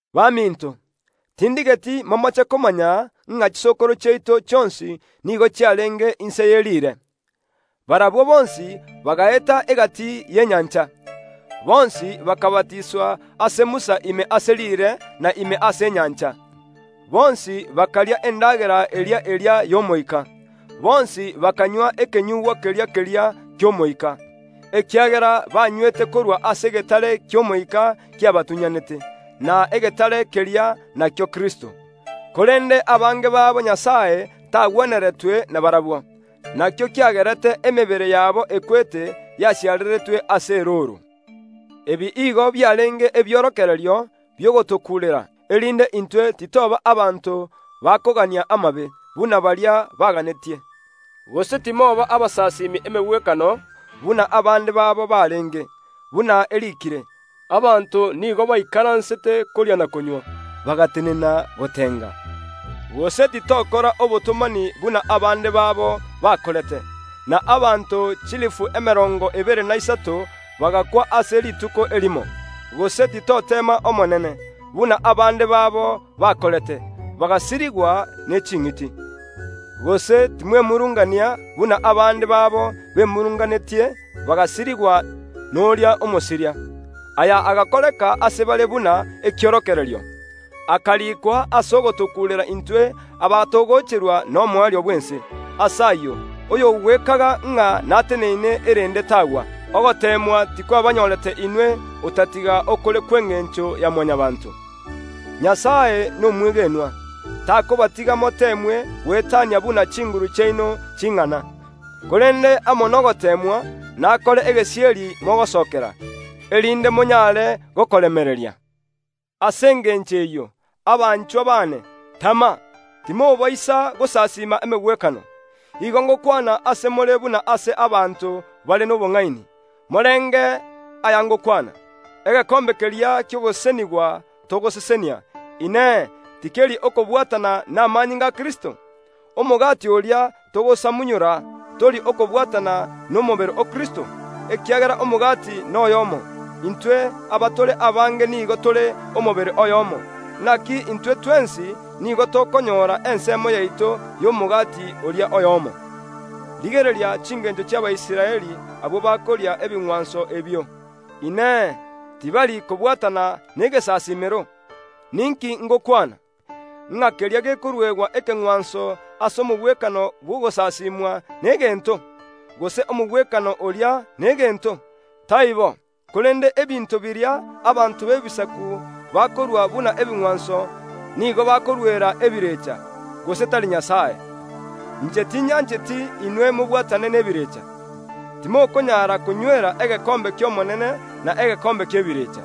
Baminto, tindigeti momoche komanya ng’a chisokoro chiaito chionsi nigo chiarenge inse ye riire. Barabwo bonsi bagaeta egati y’enyancha; bonsi bakabatiswa ase Musa ime ase riire na ime ase enyancha. Bonsi bakaria endagera eria eria y’omoika. Bonsi bakanywa ekenyugwa keria keria ki’omoika, ekiagera banywete korwa ase egetare ki’omoika kiabatunyanete; na egetare keria nakio Kristo. Korende abange babo Nyasae tagweneretwe nabarabwo, nakio kiagerete emebere yabo ekwete yasiareretwe ase erooro. Ebi igo biarenge ebiorokererio bi’ogotokuurera, erinde intwe titoba abanto bakogania amabe, buna baria baganetie. Gose timoba abasasimi emegwekano buna abande babo barenge; buna eriikire, “Abanto nigo baikaransete koria na konywa, bagatenena gotenga.” Gose titokora obotomani buna abande babo bakorete, na abanto chilifu emerongo ebere na isato bagakwa ase rituko erimo. Gose titoteema Omonene, buna abande babo bakorete, bagasirigwa ne ching’iti. Gose timwemurungania buna abande babo bemurunganetie bagasirigwa noria Omosiria. Aya agakoreka ase bare buna ekiorokererio, akarikwa ase ogotokuurera intwe abatogocherwa nomoerio bw’ense. Ase ayio oyogwekaga ng’a nateneine erende tagwa. Ogoteemwa tikwabanyorete inwe, otatiga okore kw’engencho ya Mwanyabaanto. Nyasae nomwegenwa, takobatiga moteemwe goetania buna chinguru chiaino ching’ana, korende amo nogoteemwa nakore egesieri mogosokera, erinde monyare gokoremereria. Ase engencho eyio, abanchwa baane, tama, timobaisa gosasiima emegwekano. Igo ngokwana ase more buna ase abanto bare nobong’aini; morenge aya ngokwana. Egekombe keria ki’ogosesenigwa togosesenia, Inee, tikeri okobwatana namanyinga a Kristo? Omogati oria togosamunyora, tori okobwatana nomobere o Kristo? Ekiagera omogati noyomo, intwe abatore abange nigo tore omobere oyomo; naki intwe twensi nigo tokonyora ensemo yaito y’omogati oria oyomo. Rigereria chingencho chi’Abaisraeli; abwo bakoria ebing’wanso ebio, Inee, tibari kobwatana negesasiimero? Ninki ngokwana? Ng’a keria gekoruegwa ekeng’wanso ase omogwekano bw’ogosasimwa negento? Gose omogwekano oria negento? Taibo, korende ebinto biria abanto b’Ebisaku bakorua buna ebing’wanso nigo bakoruera ebirecha, gose tari Nyasae. Inche tinyancheti inwe mobwatane nebirecha. Timokonyara konywera egekombe ki’Omonene na egekombe ki’ebirecha.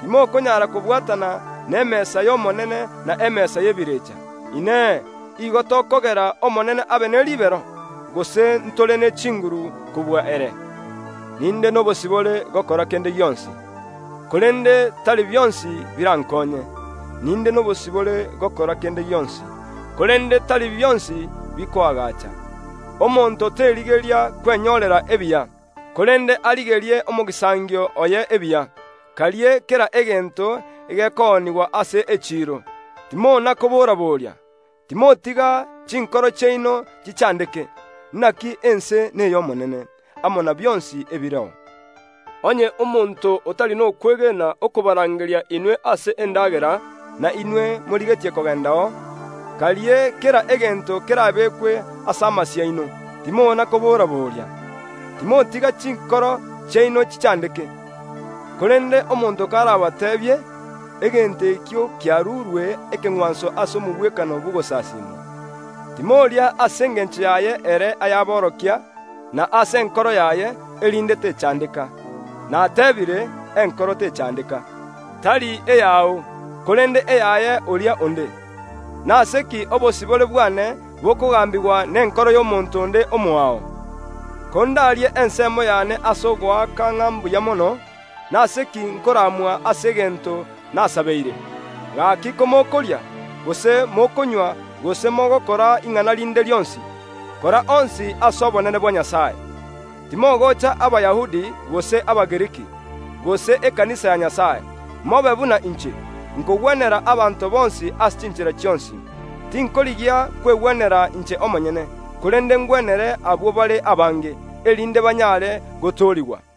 Timokonyara kobwatana nemesa y’Omonene na emesa y’ebirecha. Inee! Igo tokogera Omonene abe ne ribero? Gose ntore ne chinguru kobua ere? “Ninde nobosibore gokora kende gionsi”, korende tari bionsi birankonye. “Ninde nobosibore gokora kende gionsi”, korende tari bionsi bikoagacha. Omonto terigeria kwenyorera ebiya, korende arigerie omogisangio oye ebiya. Karie kera egento egekoonigwa ase echiiro, timona koboraboria. Timotiga chinkoro chiaino chichandeke. “Naki ense ney’Omonene, amo na bionsi ebireo.” Onye omonto otari nokwegena okobarangeria inwe ase endagera, na inwe morigetie kogendao; karie kera egento kerabeekwe ase amasio aino, timona kobora‐boria. Timotiga chinkoro chiaino chichandeke. (Korende omonto karabateebie, “Egento ekio kiarurwe ekeng’wanso ase omogwekano bw’ogosasiimwa”, timoria ase engencho yaye ere ayaborokia, na ase enkoro yaye, erinde techandeka. Natebiire “enkoro techandeka”, tari eyao, korende eyaye oria onde.) Nase ki obosibore bwane bokogambigwa nenkoro y’omonto onde omoao? Kondarie ensemo yane ase ogoaka ng’a mbuya mono, nase ki nkoramwa ase egento nasabeire? Gaki komokoria, gose mokonywa gose mogokora ing’ana rinde rionsi, kora onsi ase obonene bwa Nyasae. Timogocha Abayahudi gose Abagiriki, gose ekanisa ya Nyasae. Mobe buna inche; nkogwenera abanto bonsi ase chinchera chionsi. Tinkorigia kwegwenera inche omonyene, korende ngwenere abwo bare abange, erinde banyare gotoorigwa.